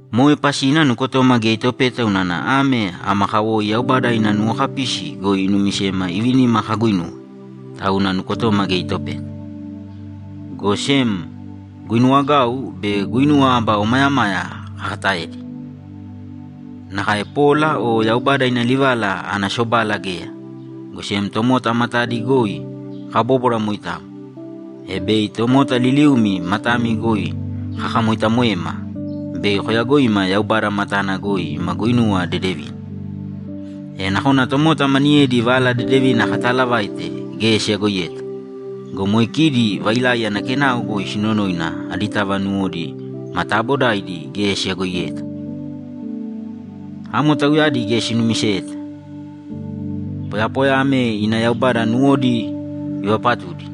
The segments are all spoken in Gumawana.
Moe pasina nukotoma geya itopeta unana ame ama kawoi Yaubada ina nuwokapisi goi inumisema ivinima kaguuinuwe, tauna nukotoma geya itopeta. Go sem guinuwagau be guinuwa aba omayamaya kakataedi. Nakae pola o Yaubada ina livala ana sobala geya, go sem tomota matadi goi kabóbwara moitamo, e bei tomota liliumi matami goi kakamoitamoema bei koyagoima Yaubada matana goi ima guinuwa dedevina. E nakona tomota maniyedi Vala Dedevina kataalavaite geya siyagoiyeta go, moe kidi vailai ana kenao goi sinonoina aditava nuwodi ma taabodaidi geya siyagoiyeta. Amo tauyadi geya sinumiseta. Poyapoya ame ina yaubada nuwodi ivapatudi,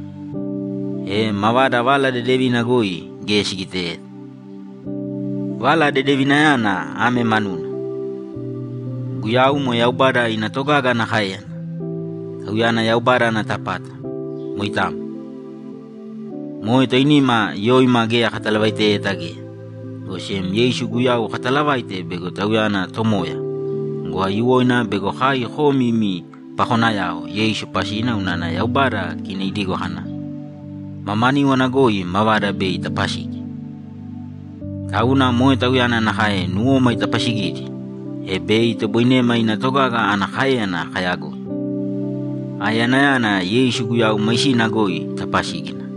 e mavada Vala Dedevina goi geya sigiteyeta. Vala Dedevinayana ame manuna: Guyau moe Yaubada ina togaga ana káeyana, Tauyana Yaubada ana tapata. Moitamo. Moe toinima yoima geya katalavaiteyeta geya, go sem Yeisu Guyau katalavaite bego Tauyana Tomoya go, aiyuwoina bego kai komi imi pakonayao Yeisu pasina unana Yaubada kina idigo kana, ‘Mamaníwana goi mavada bei itapasigi.’ Tauna moe Tauyana nakae nuwoma itapasigidi, e bei itoboinema ina togaga ana káeyana kayagoi; aeyanayana Yeisu Guyau maisina goi itapasígina.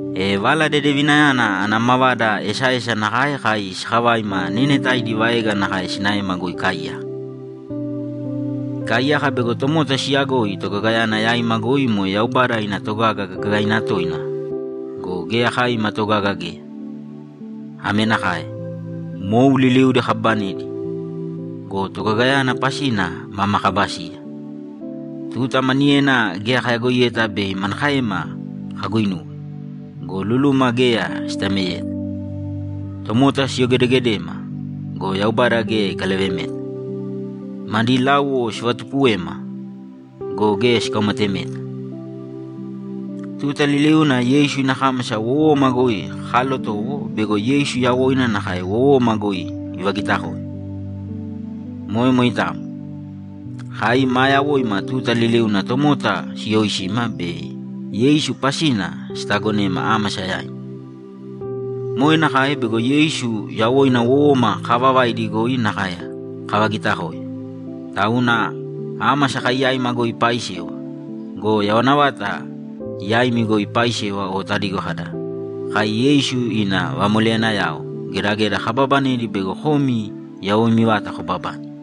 E Vala Dedevinayana ana mavada esaesa nakae kai sakavaima neenetaidi vaega nakae sinaema goi ikaaiyaka. Ikaiyaka bego tomota siyagoi togagayana yaima goi moe Yaubada ina togaga gagaina toina go, geya kai ima togaga geya. Ame nakae: Mou liliudi kababanedi go, togagayana pasina mama kaba siya. Tuta maniyena geya kayagoiyeta bei manakaema kaguinuwe go, luluma geya sitameyeta. Tomota siyogedegedema go, Yaubada geya ikalavemeta. Madi láuwo sivatupuwema go, geya sikaumatemeta. Tuta liliuna Yeisu ina kámasa wowoma goi kaalotowo bego Yeisu yawoina nakae wowoma goi ivagitakoe. Moe moitamo. Kai maa yawoima tuta liliuna tomota siyooisima be Yeisu pasina sitaagonema ámasa yaina. Moe nakae bego Yeisu yawoina wowoma kaavavaidi goi nakae kavagitakoe. Tauna ámasa kai yaima goi ipaaisewa go, yawana vata yaimi goi ipaaisewa o tadigo kada, ‘Kai Yeisu ina vamoleyanayao gedageda kabaabanedi bego komi yawoimi vata kobabane.’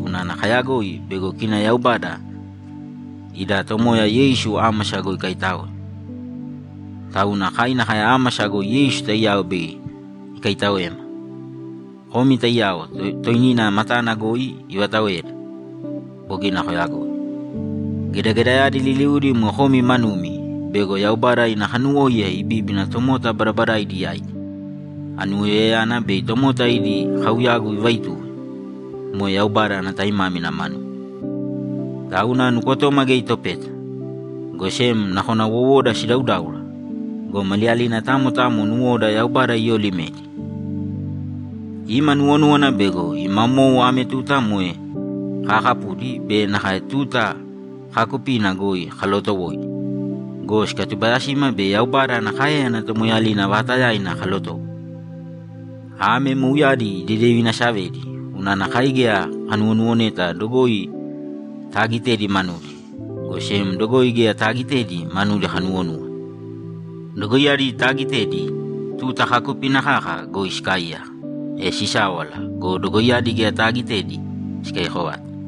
unana kayagoi bego kina Yaubada ida Tomoya Yeisu ámasa goi ikaitáoe, tauna kai nakae ámasa goi Yeisu taiyao bei ikaitaoema, komi taiyao toinina matana goi ivataoeda. Bogina koyagoi. Gedagedayadi liliudi moe komi manumi bego Yaubada ina kanuwóiya ibibíbina tomota badabadaidi yaidi; anuwoiyayana bei tomota idi kauyagu ivaituwe. Moe Yaubada ana taimámina manuna. Tauna nukotoma geya itopeta, go sem nakona wowoda sidaudáura go, maliyalina tamo tamo nuwoda Yaubada iyoolimedi. Ima nuwonúwana bego ima mou ame tuta moe kaakapudi be nakae tuta kaakupina goi kalootowoidi go, sikatubayasima bei Yaubada ana káeyana tomoeeyalina vaatayaina kalotowo. Ame mouyadi idedevinasavedi unana kai geya kanuwonuwoneta dogoi taagitedi manudi, go sem dogoi geya taagitedi manudi kanuwonúwana. Dogoiyadi taagitedi, tuta kaakupina kaka goi sikaaiyaka, e sisáwala go, dogoiyadi geya taagitedi sikaiyako vata.